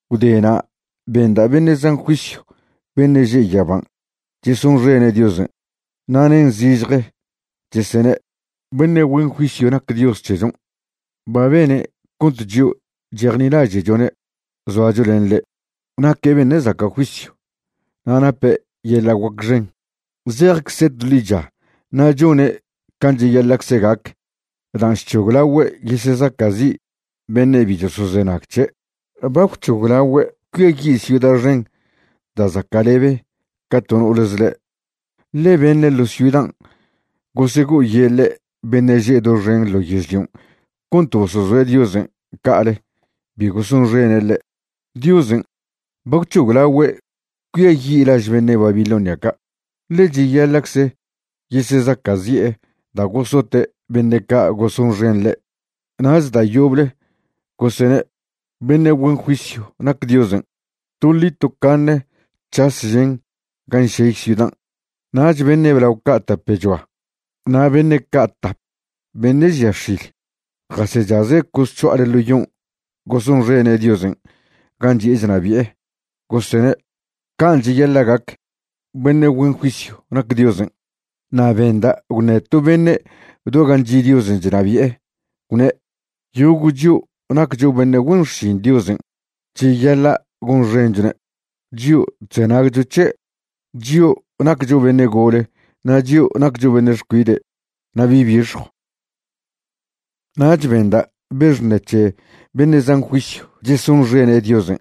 Gwdena' benda' beṉe' zan juisyw beṉe' že' yaban' chesonxene' Diosen', na' nen zižje, chesene': Beṉe' güen juisyw nac Dios c̱hechon'. Ba bene' cont chio' chejnilaže'chone' zoacho len ḻe'. Naque' beṉe' zaca' juisyw, na' nape' yeḻa' guac xen. Zejcze' to ḻicha na' chone' can' cheyaḻa'cze gac dan' chc̱hoglagüe' yesezaca'zi' beṉe' bi chosozenag c̱he'. Ba gwc̱hoglagüe' cuiayi' ciuda xen da' zaca'lebe ca to no'ole zḻe', ḻe beṉe' ḻo ciudan' gosego'oyeḻe' beṉe' že' doxen ḻo yežlion' cont bosozoe' Diosen' ca'ale bi gosonxene' ḻe'. Diosen' ba gwc̱hoglagüe' cuiayi' laž beṉe' Babilonia ca', ḻe cheyaḻa'cze yesezaca'zi'e da' gosote' beṉe' ca' gosonxen ḻe'. Nach da' yoble gosene': ―Beṉe' güen juisyw nac Diosen'. Toḻi tocaṉe c̱has žen gan' šey ciudan'. Nach beṉe' blao ca' tapechoa na' beṉe' ca' tap beṉe' žia x̱il jasechaze' cosc̱ho'ale ḻo yon' gosonxene' Diosen' gan' chi'e chnabi'e, gosene': ―Can' cheyaḻa' gac. Beṉe' güen juisyw nac Diosen'. Na' benda' gwṉe to beṉe' do gan' chi' Diosen' chnabi'e, gwne': Yogo' chio' naccho beṉe' güen xšin Diosen' cheyaḻa' gonxenchone', chio' chzenagcho c̱he', chio' naccho beṉe' gole na' chio' naccho beṉe' xcuide' na' bi' bixjw. Nach benda' be xṉe c̱he beṉe' zan juisyw chesonxene' Diosen'.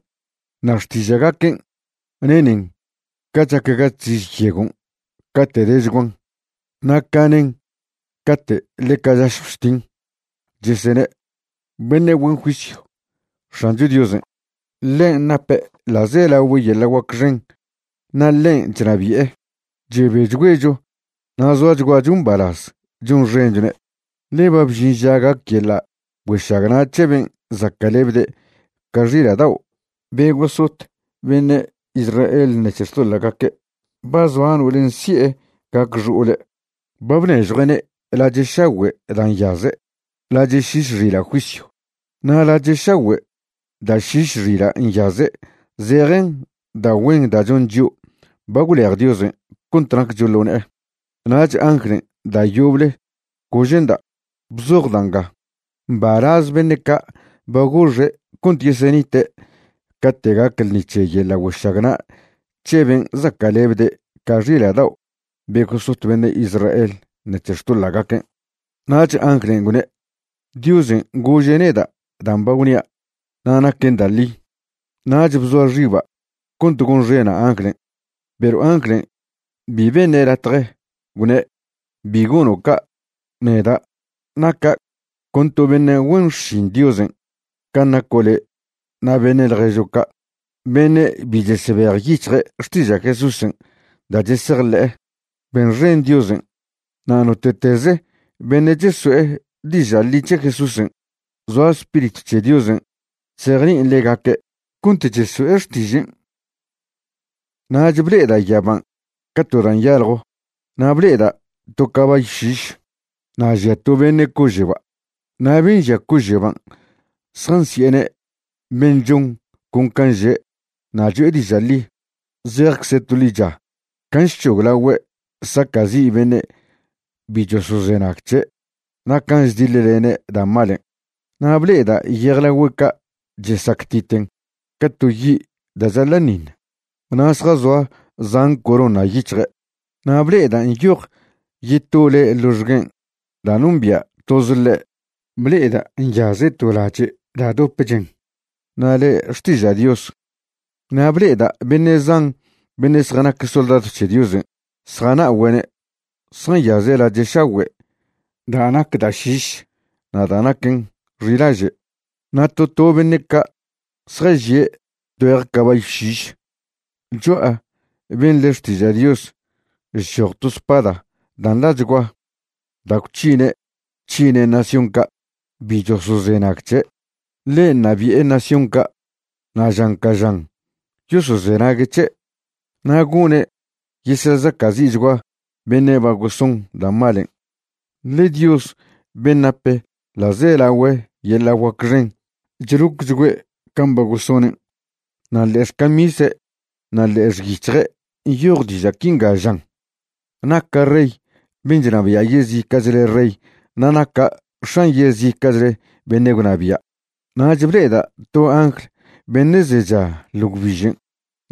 Na' xtiža'gaquen' nenen ca chac ga chziž yegon' cate' dechguan na' ca nen cate' ḻeca chašjw chtin, chesene': ¡Beṉe' güen juisyw X̱ancho Diosen'! Ḻen' nape' ḻa'zelagüe yeḻa' guac xen na' ḻen' chnabi'e. Chebechgüecho na' zoachguacho mbalaz chonxenchone'. Ḻe ba bžin ža gac yeḻa' güešagna' c̱he ben' zaca'lebde' ca xila' dao' be gosot beṉe' Israel ṉec̱he xtoḻa'gaque'. Ba zoa no'olen' si'e gac xo'ole'. Ba bnežjue'ne' lache' šagüe' da' nyaze', lache' šiš xila' juisyw. Na' lache' šagüe' da' šiš xila' nyaze' zejen da' güen da' chon chio' ba gwlej Diosen' cont naccho ḻo ne'e. Nach anglen' da' yoble gože'nda': ―Bzoj da' nga: “Mbalaz beṉe' ca' ba goxe' cont yesenite' cate' gac ḻṉi c̱he yeḻa' güešagna' c̱he ben' zaca'lebde' ca xila' dao' be gosot beṉe' Israel ṉec̱he xtoḻa'gaquen'.” Nach anglen' gwne': ―Diosen' gože' neda' dan' ba gwnia', na' naquen da' ḻi. Nach bzoa xiba' cont gonxena' anglen', perw anglen' bi beṉe' latje, gwne': ―Bi gono' ca'. Neda' naca' con to beṉe' güen xšin Diosen' can' naco' le' na' beṉe' ḻježo' ca' beṉe' bi chesebejyic̱hje' xtiža' Jesúsen' da' chesejḻe'e. Benxen Diosen'. Na' note'teze beṉe' cheso'e diža' ḻi c̱he Jesúsen', zoa Spiritw c̱he Diosen' chzejni'in ḻegaque' cont cheso'e xtižen'. Nach ble'eda' yaban' ca to da' nyaljo, na' ble'eda' to cabayw šiš na' žia to beṉe' cože'ba'. Na' ben' žia cože'ban' zjansi'ene' Ben' Chon Con Can' Že' na' Cho'e Diža' Ḻi. Zejcze' to ḻicha can' chc̱hoglagüe' saca'zi' beṉe' bi chosozenag c̱he' na' can' chdiḻlene' da' malen'. Na' ble'eda' yejlagüe' ca' chesactiten ca to yi' da' chaḻa'ṉiṉ, na' zjazoa zan corona yic̱hje'. Na' ble'eda' nyoj yeto le' ḻoxguen' da' nombia' toze ḻe'. Ble'eda' nyaze' to lache' da' dope chen, na' le' Xtiža' Dios. Na' ble'eda' beṉe' zan beṉe' zjanac soldadw c̱he Diosen' zjana'ogüe'ne', zjanyaze' lache' šagüe' da' nac da' šiš na' da' naquen xilaže', na' to to beṉe' ca' zjažie' tgüeje cabayw šiš. Cho'a ben' le' Xtiža' Dios chchoj to spada da' nḻachgua da' gwc̱hine' c̱hine' nación ca' bi chosozenag c̱he'. Ḻe ṉabi'e nación ca' na' žan ca žan yosozenague' c̱he'. Na' gone' yesezaca'zi'chgua beṉe' ba goson da' malen', ḻe Dios ben' nap ḻa'zelagüe yeḻa' guac xen chlocchgüe' can' ba gosonen'. Na' ḻe'e xcamise' na' ḻe'e xic̱hje' nyoj diža' quinga žan: “Naca' Rey ben' chnabia' yezica'chle rey na' naca' X̱an yezica'chle beṉe' gwnabia'.” Nach ble'eda' to angl beṉe' zecha ḻo gwbižen',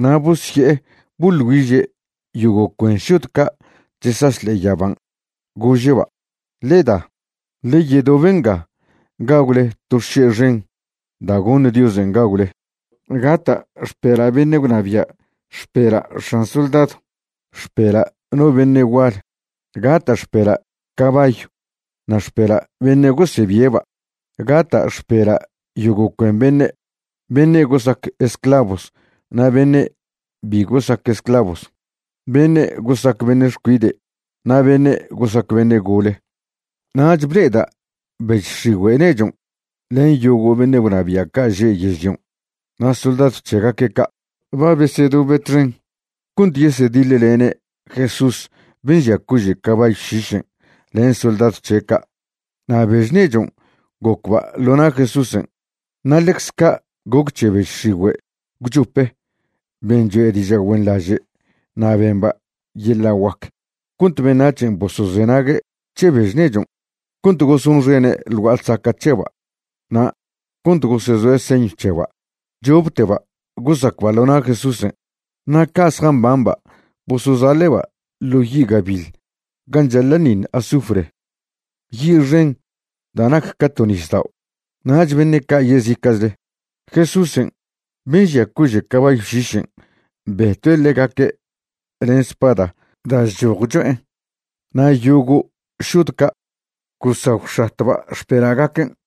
na' bosye'e boḻ güiže' yogo' cuen šod ca' chesaš ḻe'e yaban', gože'ba': ―Ḻe da, ḻe yedobe nga gagwle to xše' xen da' goṉ Diosen' gagwle. Gata' xpela' beṉe' gwnabia', xpela' x̱an soldadw, xpela' no beṉe' gual. Gata' xpela' cabayw na' xpela' beṉe' gosebie'ba'. Gata' xpela' yogo' cuen beṉe', beṉe' gosac esclavos na' beṉe' bi gosac esclavos, beṉe' gosac beṉe' xcuide' na' beṉe' gosac beṉe' gole. Nach ble'eda' bež x̱igüe' nechon' len yogo' beṉe' gwnabia' ca' že' yežlion' na' soldadw c̱hegaque' ca'. Ba besedobe' txen cont yesediḻlene' Jesús ben' žia cože' cabayw šišen' len soldadw c̱he' ca'. Na' bež nechon' gocba' ḻo na' Jesúsen'. Na' ḻecze ca' goc c̱he bež x̱igüe' gwchope ben' choe' diža' güenḻaže' na' bemba' yeḻa' guac cont beṉac̱hen' bosozenague' c̱he bež nechon', cont gosonxene' ḻ gua'a ḻsaca' c̱heba' na' cont gosezoe' señw c̱heba'. Chopteba' gosacba' ḻo na' Jesúsen', na' ca' zjambamba' bosozaḻe'ba' ḻo' yi' gabiḻ gan' chaḻa'ṉiṉ azufre, yi' xen da' nac ca to nisdao'. Nach beṉe' ca' yezica'chle, Jesúsen' ben' žia cože' cabayw šišen' betue' ḻegaque' len spada da' chchoj cho'en', na' yogo' šod ca' gosagwx̱atba' xpela'gaquen'.